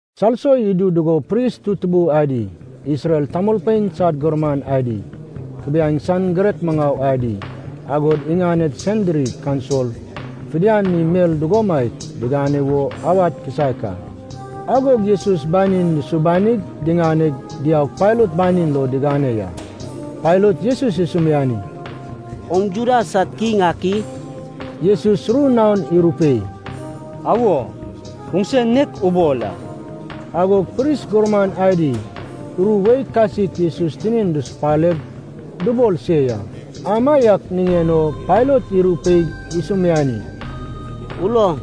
Salso idu dugo pris tutubui adi, Isrel tamolpein sad gurman adi, kubiaeŋ san girek maŋau adi, agod iŋaned Sanhedrin kaunsil fidian mi mel dugomaiak digane wo awad kisaek a. Agog Jesus banin dusubanig, diŋaneg, diaug Pailat banin lo digane ya. Pailat Jesus isumiani, “Oŋ Juda sad kiŋ ak i?” Jesus ru naon irupei, “Awo, oŋse nek ubol a.” Agog pris gurman adi ru wei kasik Jesus tinin dusupaleg dubol se ya. Amaiak niŋen o Pailat irupeig isumiani, “Uloŋ,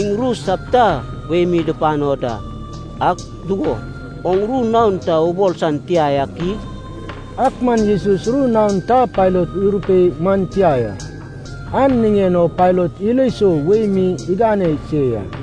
iŋ ru sapita wei mi dupano da. Ak dugo, oŋ ru naon ta ubol san tia yak i?” Ak man Jesus ru naon ta Pailat irupei man tia ya, an niŋen o Pailat ilo sou wei mi igane se ya.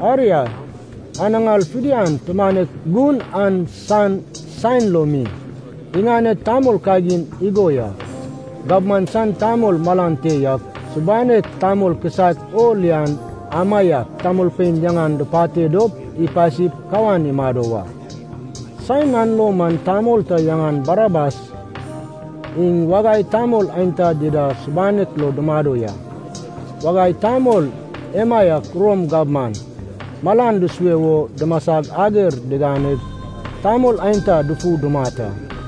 Aria, anaŋar fidian, tumanek gun an san saen lo mi, iŋaned tamol kagin igo ya. Gabman san tamol malan te yak, subanek tamol kisaek o lian amaiak tamolpein yaŋan dupate dop, ipasip kawan imado wa. Saen an lo man tamol ta yaŋan Barabas iŋ wagai tamol aenta dida subanek lo dumado ya. Wagai tamol emaiak Rom gabman malan dusue wo dumasag ager diganeg tamol aenta dufu dumat a.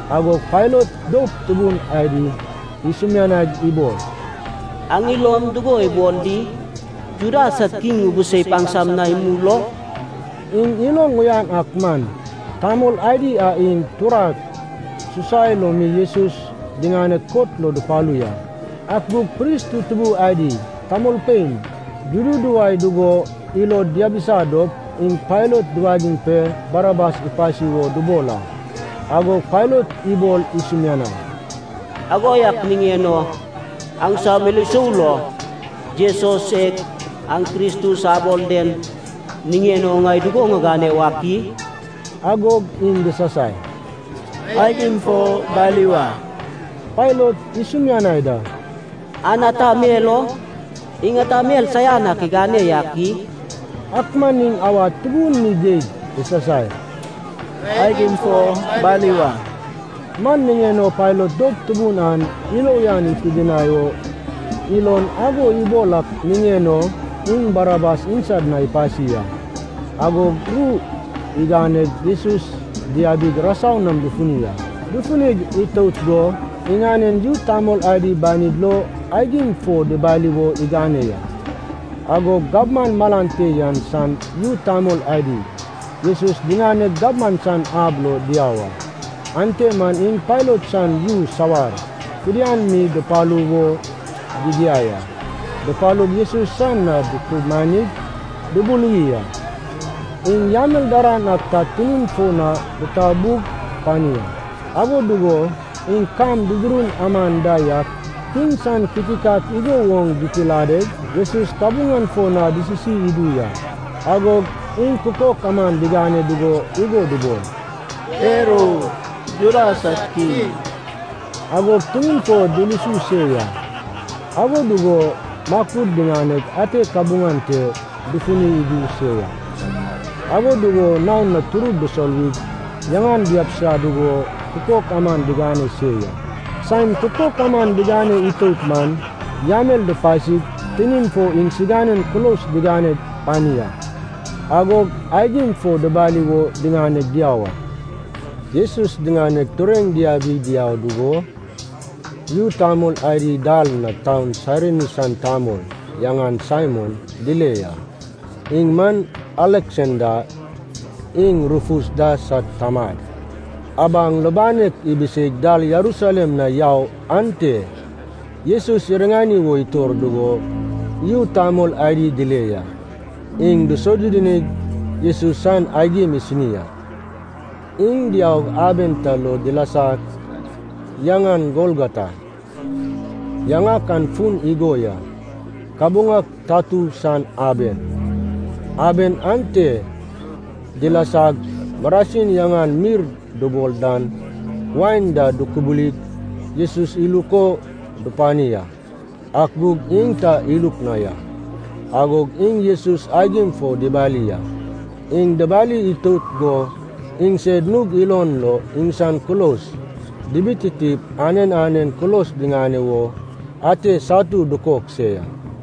Agog Pailat doup tubun adi isumianaig ibol, “Aŋ ilom dugo ibol di? Juda sad kiŋ ŋubuseip aŋsam na imul o?” Iŋ iloŋ uyan ak man, tamol adi an iŋ turak susai lo mi Jesus diŋaneg kot lo dupalu ya. Ak gug pris tutubui adi tamolpein dududuwai dugo ilod diabisa dop, iŋ Pailat duwagiŋ pe Barabas ipasi wo dubol a. Agog Pailat ibol isumianai, “Ago yak niŋen o aŋsam ilo sou lo, Jesus e aŋ Kristus abol den niŋen o ŋai dugo ŋigane wak i?” Agog iŋ disasai, “Aigim fo bali wa!” Pailat isumianai da, “An ata mel o? Iŋ ata mel saian ak igane yak i?” Ak man iŋ awad tubun mi geig disasai, “Aigim fo bali wa!” Man niŋen o Pailat doup tubun an ilo uyan ipidinai o ilon ago ibol ak niŋen o, iŋ Barabas iŋsad na ipasi a. Agog ru iganeg Jesus diabig rasau nam dufuni a. Dufunig itout go iŋanen yu tamol adi banid lo aigim fo dibali wo igane ya. Agog gabman malan te yan san yu tamol adi, Jesus diŋaneg gabman san ab lo diau a. Ante man iŋ Pailat san yu sawar fidian mi dupalu wo digiai a. Dupalug Jesus san na dutumanig dubuluwi a. Iŋ yamel daran ak ta tinin fo na ditabug pani a. Ago dugo iŋ kam dudurun aman da yak, kiŋ san kitikat igo woŋ ditiladeg, Jesus kabuŋan fo na disisi idu ya. Agog iŋ kukok aman digane dugo igo dubol, “Per o, Juda sad Kiŋ!” Agog tinin fo dulusu se ya, ago dugo makud diŋaneg ate kabuŋan te dufuni idu se ya. Ago dugo naon na turud disoluwig, yaŋan diabisa dugo kukok aman digane se ya. Saen kukok aman digane itout man, yamel dupasig tinin fo iŋsiganen kulos digane pani a. Agog aigim fo dibali wo diŋaneg diau a. Jesus diŋaneg tureŋ diabig diau dugo, yu tamol adi dal na taun Sairini san tamol, yaŋan Saimon, dile ya. Iŋ man Aleksanda iŋ Rufus da sad tamad, abaŋ lubanek ibiseig dal Jerusalem na yau ante Jesus iriŋani wo itor dugo, yu tamol adi dile ya. Iŋ disodudunig Jesus san aigim isini a. Iŋ diaug aben ta lo dilasa, yaŋan Golgota. Yaŋak an fun igo ya, “Kabuŋak tatu san aben.” Aben ante dilasag, marasin yaŋan mirr dubol dan wain da dukubulig Jesus iluk o dupani a, ak gug iŋ ta iluk na ya. Agog iŋ Jesus aigim fo dibali a. Iŋ dibali itout go iŋsed nug ilon lo iŋsan kulos dibititip anen anen kulos diŋane wo ate satu dukok se ya.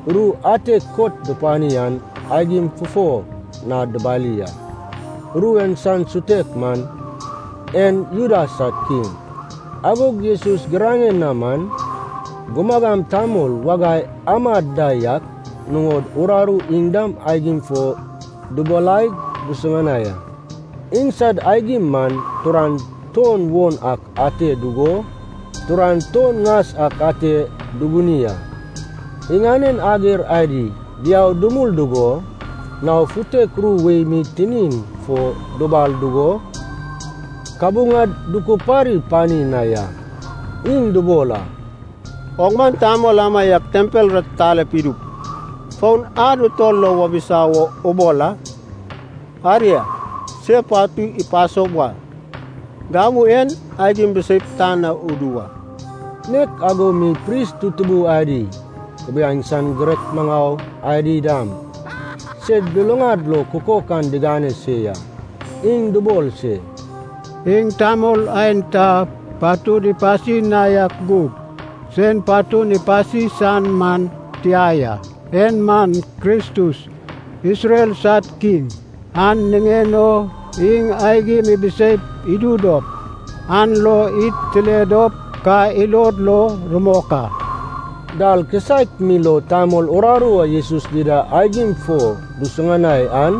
Ru ate kot dupani an, aigim fufo na dubali a. Ru en san sutek man, En Juda sad Kiŋ. Agog Jesus giraŋen na man, gumagam tamol wagai amad da yak nuŋod uraru iŋ dam aigim fo dubalaig dusuŋanai a. Iŋsad aigim man turan tuon won ak ate dugo, turan tuon ŋas ak ate duguni a. Iŋanen ager adi diau dumul dugo nao futek ru wei mi tinin fo dubal dugo, kabuŋad dukupari pani na ya. Iŋ dubol a, “Oŋ man tamol amaiak tempel ratitale idup, fon ad utol lo wabisa wo ubol a! Aria, se patu ipaso wa, gamu en aigim biseip tan na udu wa!” Nek ago mi pris tutubui adi, kubiaeŋ san girek maŋau adi dam, sed luluŋad lo kukok an digane se ya. Iŋ dubol se, “Iŋ tamol aenta patud ipasi na yak gug, sen patun ipasi san man tia ya! En man Kristus, Isrel sad Kiŋ. An niŋen o iŋ aigim ibiseip idu dop, an lo id tile dop ka ilod lo rumok a.” Dal kisaek mi lo tamol uraru a Jesus dida aigim fo dusuŋanai an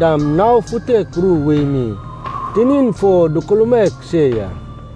dam nao futek ru wei mi tinin fo dukulmaek se ya.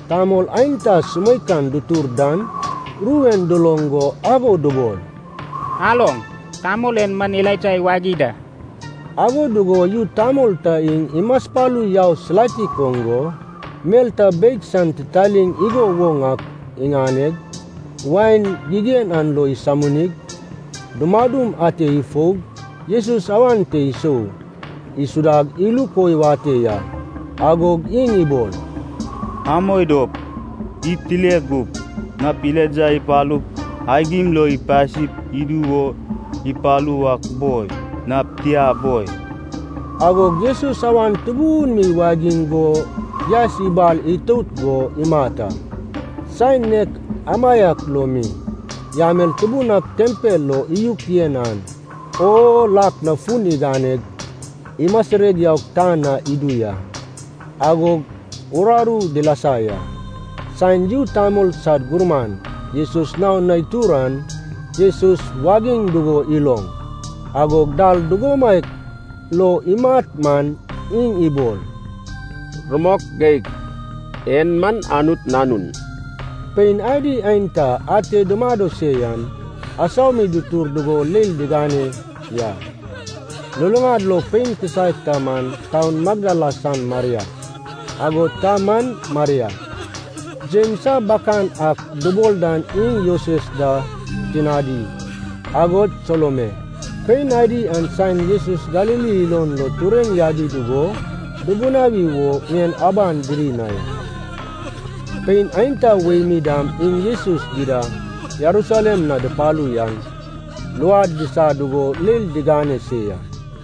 Tamol aenta sumeikan dutur dan, ru en duloŋ go ago dubol, “Aloŋ, tamol en man Elaija iwagi da.” Ago dugo yu tamol ta iŋ imaspalu yau silatik oŋ go, mel ta beig san titaliŋ igo woŋ ak iŋaneg, wain gigen an lo isominig, dumadum ate ifoug, Jesus awan te isou isudag iluk o iwate ya. Agog iŋ ibol, “Amoi dop id tile gup, nap Elaija ipalup aigim lo ipasip idu wo ipalu wak boi, nap tia boi.” Agog Jesus awan tubun mi iwagiŋ go yaes ibal itout go imat a. Saen nek amaiak lo mi, yamel tubun ak tempel lo iyuk yen an, o lak na fun iganeg imasireg yaug tan na idu ya, agog uraru dilasa ya. Saen yu tamol sad gurman Jesus naon na itur an, Jesus wagiŋ dugo iloŋ, agod dal dugomaiak lo imat man, iŋ ibol, “Rumok geig, en man Anut Nanun!” Pein adi aenta ate dumado se yan, asau mi dutur dugo leil digane ya. Luluŋad lo pein kisaek ta man taun Magdala san Maria, agod ta man Maria, Jems a bakan ak dubol dan iŋ Joses da tinadi, agod Salome. Pein adi an saen Jesus Galili ilon lo tureŋ yabi dugo dubunawi wo ŋien aban diri na ya. Pein aenta wei mi dam iŋ Jesus dida Jerusalem na dupalu yan luad disa dugo leil digane se ya.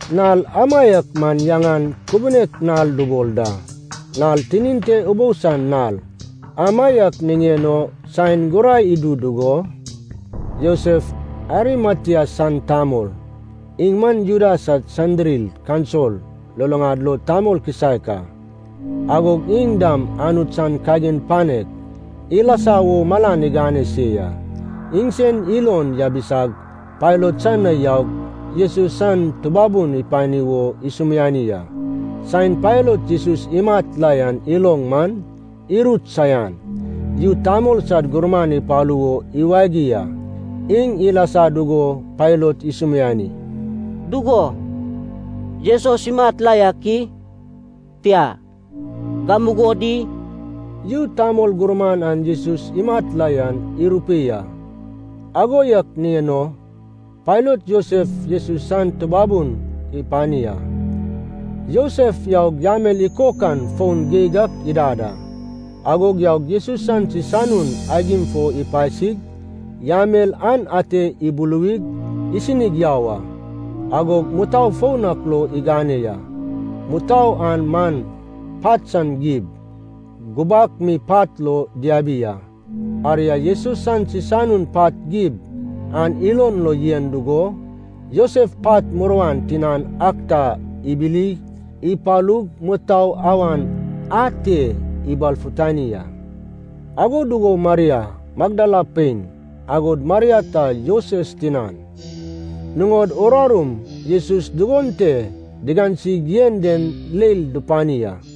Nal amaiak man yaŋan Kubunek Nal dubol da. (Nal tinin te ubou san nal.) Amaiak niŋen o saen gurai idu dugo, Josef Arimatea san tamol, iŋ man Juda sad Sanhedrin kaunsil luluŋad lo tamol kisaek a, agod iŋ dam Anut san kagin panek ilasa wo malan igane se ya. Iŋsen ilon yabisag Pailat san na yaug Jesus san tubabun ipani wo isumiani a. Saen Pailat Jesus imat la yan iloŋ man, irut saian. Yu tamol sad gurman ipalu wo iwagi a. Iŋ ilasa dugo Pailat isumiani, “Dugo, Jesus imat la yak i? Tia, gamugo di?” Yu tamol gurman an Jesus imat la yan irupei a. Ago yak niŋen o Pailat Josef Jesus san tubabun ipani a. Josef yaug yamel ikokan foun geig ak idad a, agog yaug Jesus san sisanun aigim fo ipasig, yamel an ate ibuluwig, isinig yau a. Agog mutou foun ak lo igane ya. Mutou an man pat san gib, gubak mi pat lo diabi a. Aria, Jesus san sisanun pat gib an ilon lo yen dugo, Josef pat muruan tinan ak ta ibili ipalug mutou awan ate ibalfutani a. Ago dugo Maria, Magdala pein, agod Maria ta Joses tinan, nuŋod urarum Jesus dugon te digansig yen den leil dupani a.